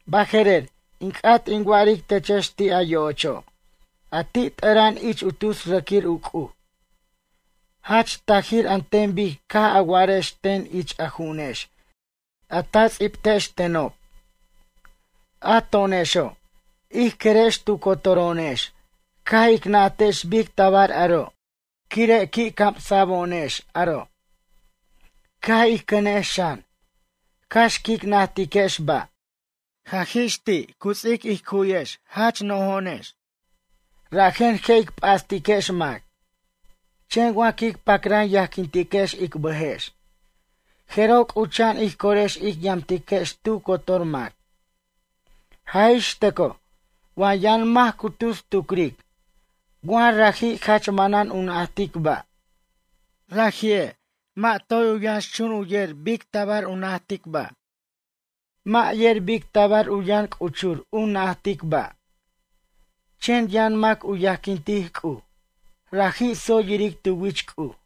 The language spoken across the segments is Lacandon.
Baje'rer, in c'at in wa'aric techex ti' a yo'ocho' a ti' t'ʌra'an ich u tus rʌquir u c'uj. Jach tajir an ten bic caj a wa'arex ten ich a ju'unex a ta tsibtex tenob: “A to'onexo', ij querex tu cotoro'onex caj ic najtex bic tabar aro', quire' qui' camsa'bo'onex aro'.” Ca' ij cʌnex xan, cax quic najtiquex ba'. Jaj ix ti' u ts'ic ij cuwiquex jach nojo'onex, rajen je' ic p'astiquex mac. Chen wa quic pacran yajquintiquex ic bʌjex, jeroj c'ucha'an ij corex ic yamtiquex tu cotor mac. Jaj ix tʌcoj wa yʌn mac cu tus tucric, wa raji' jach manan u najtic ba'. Raji'e', mʌ' toy u yʌnxchun u yer bic tabar u najtic ba', mʌ' yer bic tabar u yʌn c'uchur u najtic ba'. Chen yʌn mac u yajquintic C'uj, raji' tsoy yiric tu wich C'uj.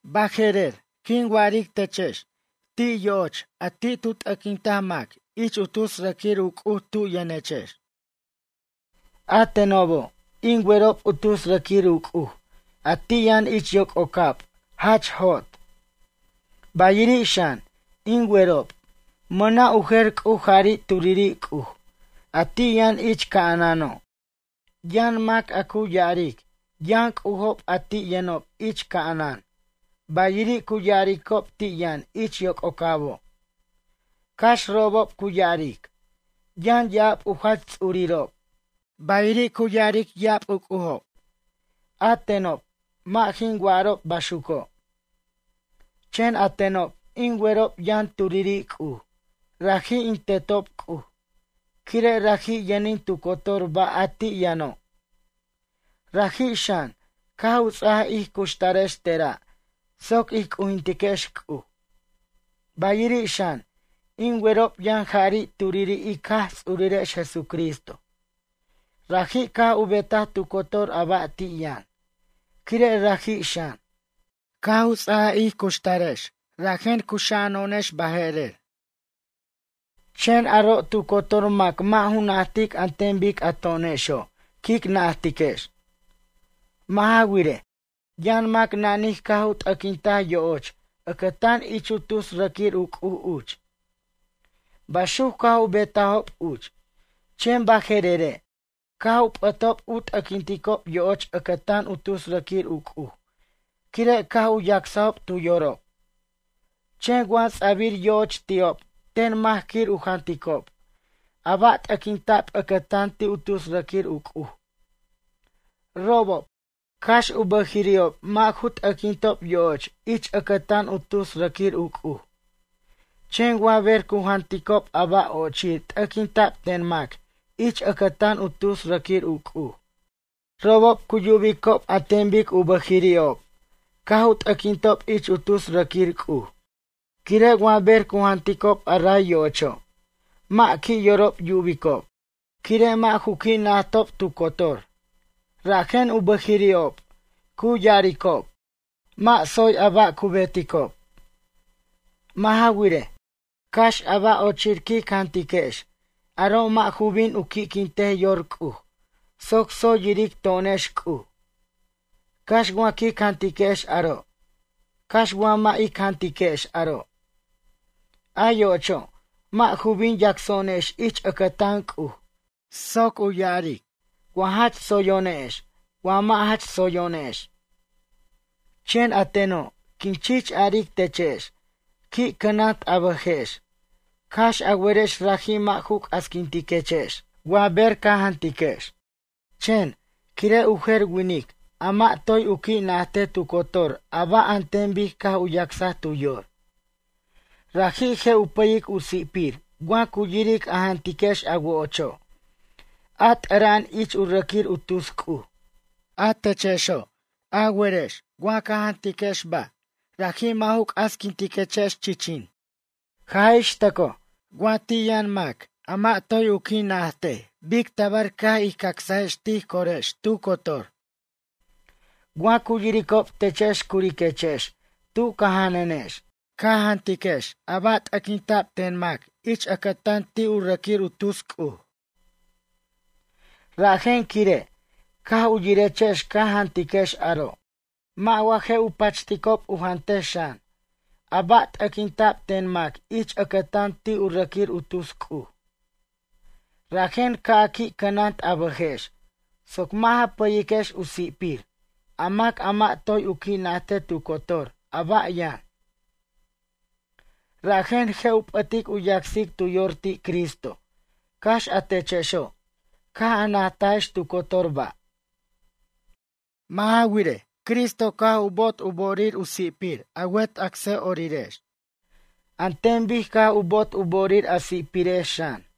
Baje'rer, quin wa'aric techex ti' yo'och a ti' tu t'ʌquinta mac ich u tus rʌquir u c'uj tu yʌnechex. A tenobo', in werob u tus rʌquir u c'uj, a ti' yʌn ich yococab jach jot. Bayiri' xan, in werob, mʌna' u jer C'uj jari' turiri' C'uj, a ti' yʌn ich ca'anano'. Yʌn mac a cu ya'aric yʌn c'ujob a ti' yʌnob ich ca'anan, bayiri' cu ya'aricob ti' yʌn ich yoc'ocabo'. Cax robob cu ya'aric, yʌn ya'ab u jach ts'urirob, bayiri' cu ya'aric ya'ab u c'ujob, a tenob mʌ' jin wa'arob baxuco'. Chen a tenob, in werob yʌn turiri' C'uj, raji' in Tetob C'uj, quire' raji' yʌnin tu cotor ba' a ti' yʌno'. Raji' xan, caj u ts'aj ij cuxtarex tera' soc ij c'ujintiquex C'uj. Bayiri' xan, in werob yʌn jari' turiri' ic Jaj Ts'urirex Jesucristo. Raji' caj u betaj tu cotor a ba' ti' yʌn, quire' raji' xan, caj u ts'aj ij cuxtarex rajen cuxa'ano'onex baje'rer. Chen aro' tu cotor mac mʌ' ju najtic an ten bic a to'onexo' quic najtiquex. Mʌ' ja wirej, yʌn mac nanij caj u t'ʌquinta yo'och ʌcʌtan ich u tus rʌquir u c'uj uch. Baxuc caj u betajob uch, chen baje'rere' caj u p'ʌtob u t'ʌquinticob yo'och ʌcʌtan u tus rʌquir u c'uj, quire' caj u yacsajob tu yorob. Chen wa ts'a'bir yo'och ti'ob ten mac quir u janticob, a ba' t'ʌquinta'b ʌcʌtan ti' u tus rʌquir u c'uj. Robob, cax u bʌjiri'ob mʌ' ju t'ʌquintob yo'och ich ʌcʌtan u tus rʌquir u c'uj, chen wa ber cu janticob a ba' ochir t'ʌquinta'b ten mac ich ʌcʌtan u tus rʌquir u c'uj, robob cu yubicob an ten bic u bʌjiri'ob caj u t'ʌquintob ich u tus rʌquir c'uj, quire' wa ber cu janticob a ray yo'ocho', mʌ' qui' yorob yubicob. Quire' mʌ' ju qui' najtob tu cotor, rajen u bʌjiri'ob cu ya'aricob, mʌ' tsoy a ba' cu beticob. Mʌ' ja wirej, cax a ba' ochir quic jantiquex, aro' mʌ' ju bin u qui'quintej yor C'uj soc tsoy yiric to'onex C'uj. Cax wa quic jantiquex aro', cax wa mʌ' ic jantiquex aro'. A yo'ocho', mʌ' ju bin yacso'onex ich ʌcʌtan C'uj soc u ya'aric wa jach tsoyo'onex wa mʌ' jach tsoyo'onex. Chen a teno', quin chich aric techex, qui' cʌnant a bʌjex, cax a werex raji' mʌ' ju c'asquintechex, wa ber ca jantiquex. Chen, quire' u jer winic a mʌ' toy u qui' najtej tu cotor a ba', an ten bic caj u yacsaj tu yor. Raji' je' u pʌyic u si'pir wa cu yiric a jantiquex a wo'ocho', a t'ʌra'an ich u rʌquir u tus c'uj. A techexo', a werex wa ca jantiquex ba', raji' mʌ' ju c'asquintex chichin. Jaj ix tʌcoj, wa ti' yʌn mac a mʌ' toy qui' najtej bic tabar caj ij cacsajex tij corex tu cotor. Wa cu yiricob techex curiquechex tu ca janʌnex, ca jantiquex a ba' t'ʌquinta'b ten mac ich ʌcʌtan ti' rʌquir u tus c'uj. Rajen quire', caj u yirechex ca jantiquex aro'. Mʌ' wa je' u pachticob u jantej xan, a ba' t'ʌquinta'b ten mac ich ʌcʌtan ti' u rʌquir u tus c'uj? Rajen ca' a qui' cʌnant a bʌjex, soc mʌ' ja pʌyiquex u si'pir, a mac a mʌ' toy u qui' najtej tu cotor a ba' yʌn. Rajen je' u p'ʌtic u yacsic tu yor ti' Cristo, cax a techexo', caj najtajex tu cotor ba'. Mʌ' ja wirej, Cristo caj u bo'ot u bo'orir u si'pir a wet acsa'orirex an ten bic caj u bo'ot u bo'orir a si'pirex xan.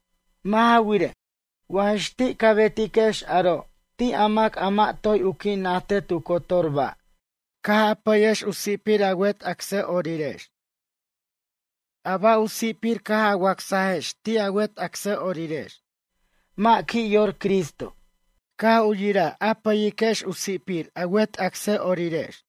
Mʌ' ja wirej, wa jix ti' ca betiquex aro' ti' a mac a mʌ' toy u qui' najtej tu cotor ba', caj a pʌyex u si'pir a wet acsa'orirex. A ba' u si'pir caj a wacsajex ti' a wet acsa'orirex, mʌ' qui' yor Cristo, caj u yiraj a pʌyiquex u si'pir a wet acsa'orirex.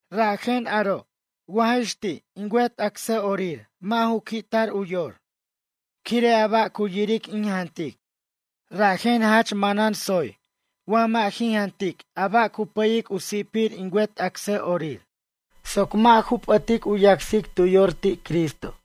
Rajen, quire' aro', wa jix ti' in wet acsa'orir mʌ' ju qui'tar u yor, quire' a ba' yiric in jantic, rajen jach manan tsoy wa mʌ' jin jantic a ba' cu pʌyic u si'pir in wet acsa'orir, soc mʌ' ju p'ʌtic u yacsic tu yor ti' Cristo.